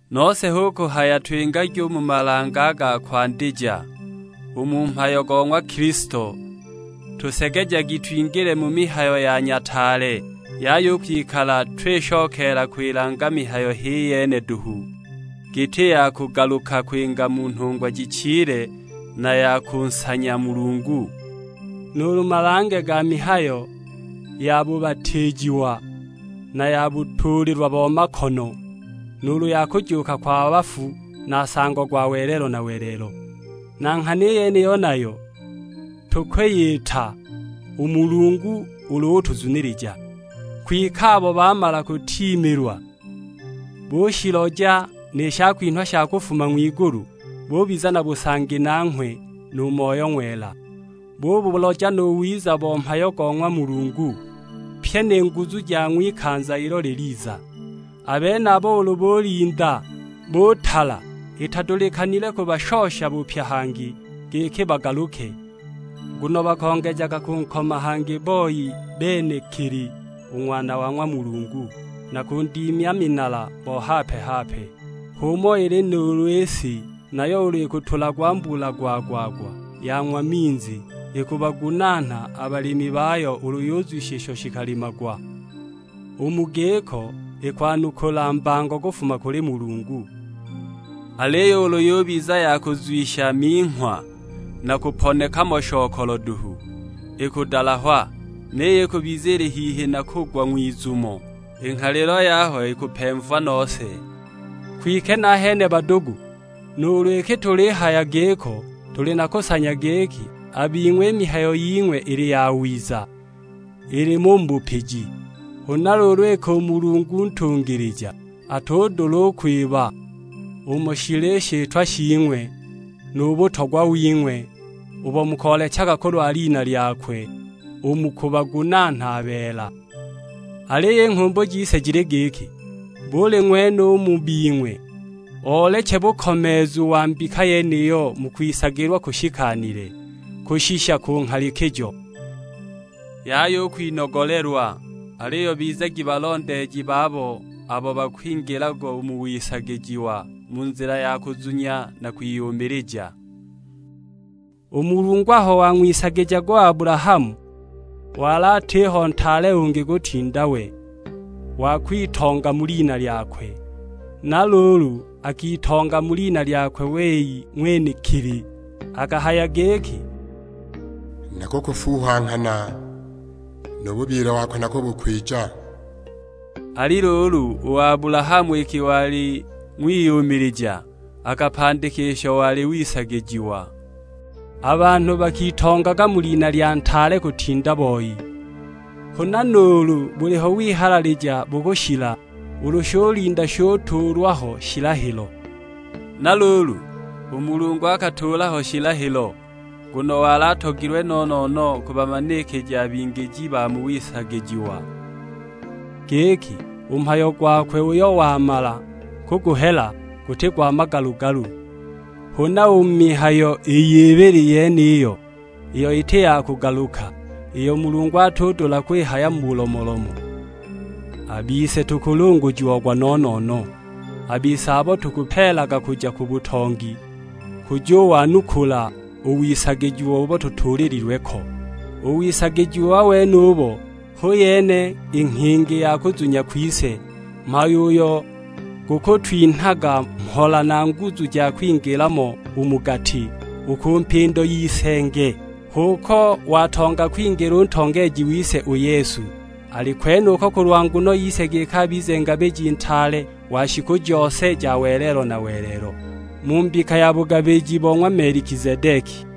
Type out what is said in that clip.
Nose hu kuhaya twingagi u mu malange a ga kwandija u mu mhayo go ng'wa Kilisto, tusegejagi twingile mu mihayo ya nyataale; yaya u kwikala twishokeela kwilanga mihayo h'iyene duhu, giti ya kugaluka kwinga mu nhungwa jichile, na ya kunsanya Mulungu; nuulu malange ga mihayo ya bubatiijiwa na ya butuulilwa bo makono, nuulu ya kujuuka kwa bafu na nsango gwa welelo na welelo. Na nghana i yeniyo nayo tukwiyita u Mulungu ulu utuzunilija. Kwike abo bamala kutiimilwa, bushiloja ni shakwinhwa sha kufuma ng'wigulu, bubiza na busangi nanghwe nu Moyo Ng'wela; bubuloja nu wiza bo mhayo go ng'wa Mulungu, pyi ni nguzu ja ng'wikanza ilo liliza; a benabo ulu bulinda butala, itadulikanile u kubashosha bupya hangi giki bagaluke, nguno bakongejaga kunkoma hangi boi benekili u Ng'wana wa ng'wa Mulungu, na kundimya minala bo hape-hape! H'umo ili nuulu i si, nayo ulu ikutulagwa mbula gwa-gwa-gwa yang'wa minzi, ikubagunaana a balimi bayo ulu yuzwisha isho shikalimagwa; u mu giko ikwanukula mbango kufuma kuli Mulungu. Aliyo ulu yubiza ya kuyuzwisha minghwa na kuponeka mo shokolo duhu, ikudalahwa; niyo ikubiza ili hihi na kugwa ng'wizumo; i nghalilo yaho ikupemva nose! Kwike nahene badugu nuulu iki tulihaya giko, tuli na kusanya giki a bing'we i mihayo ying'we ili yawiza, ilimo u mu bupiji. Huna luulu iki u Mulungu ntungilija, atudula u kwiba umo shili i shitwa shing'we nu butogwa wing'we ubo mukoolechaga kulwa lina lyakwe u mu kubagunaana a beela. Aliyo i nghumbu jise jili giki, buli ng'wene u mu bing'we ooleche bukomeezu wa mbika yeniyo mu kwisagilwa kushikanile, kushisha ku nghalikijo. Yaya u kwinogolelwa, aliyo bizagi balondeeji babo abo bakwingilaga u mu wisagijiwa mu nzila ya kuzunya na kwiyumilija. U Mulungu aho wang'wisagijaga u Abulahamu wali atiho ntaale ungi kutinda we, wa kwitonga mu lina lyakwe; na luulu akitonga mu lina lyakwe wei ng'wenekili. Akahaya giki, "Nakukufuuha nghana, nu bubyile wako nakubu kwija." Ali luulu u Abulahamu iki wali ng'wiyumilija, akapandika isho wali wisagijiwa. A banhu bakitongaga mu lina lya ntaale kutinda boi; huna nuulu buliho wihalalija bukushila, ulu shulinda shutuulwa ho shilahilo. Na luulu u Mulungu akatuula ho shilahilo, nguno wali atogilwe no-no-no kubamanikija a bingiji ba mu wisagijiwa, giki u mhayo gwakwe uyo wamala kuguhela guti gwa magalu-galu. Huna u mu mihayo iy'ibili yeniyo iyo iti ya kugaluka, iyo Mulungu atudula kwihaya mu bulomolomo, a bise tukulungujiagwa no-no-no; a bise abo tukupeelaga kuja ku butongi kujuwanukula u wisagijiwa ubo butuulilwe ko. U wisagijiwa wenubo hu yene i nghingi ya kuzunya kwise, mhayo uyo gukutwinhaga mhola na nguzu ja kwingila mo u mu gati, u ku mpindo y'isenge. H'uko watonga kwingila u ntongeeji wise u Yesu; ali kwenuko kulwa nguno yise giki abize Ngabiji Ntaale wa shiku jose ja welelo na welelo, mu mbika ya bugabiji bo ng'wa Melikizedeki.